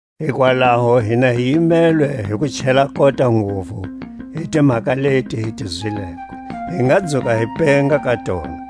Hikwalaho hina hi yimelwe hi ku chela kota nguvu hi timhaka leti hi ti zwileko, hi nga dzuka hi penga ka tona.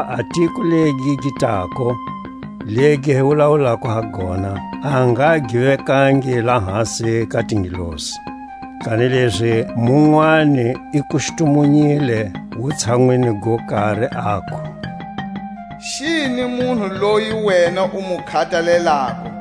Hakuva a tiko legi gi tako, legi hi wulawulako ha gona, a nga gi vekangi lahasi ka tingelosi. Kanilezi munwani i kustumunyile wutshanwini go kari, aku: Xini munhu loyi wena u mu khatalelako,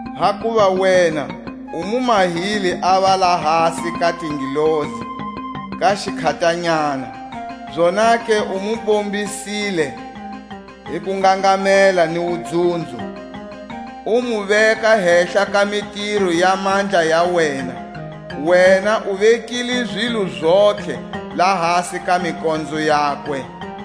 Hakuva wena u mu mahile ava lahasi ka tingelosi ka xikhatanyana, Zonake u mu bombisile hi kungangamela ni wudzunzo, U mu veka hehla ka mitiro ya mandla ya wena; Wena u vekile zilo zontlhe lahasi ka mikonzo yakwe.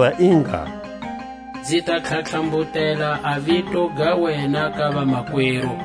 Hakuva i ngalo: Nzi ta tlhatlhambutela a vito ga wena ka vamakweru,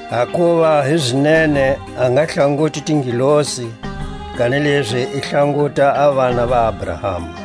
Hakuva hizinene a nga hlanguti tingelosi, kanilezi i hlanguta a vana va Abrahama.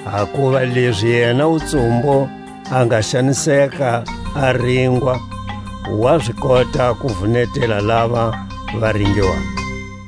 Hakuva lezi yena wutsumbu a nga xaniseka a ringwa, wa zi kota ku vunetela lava va ringiwako.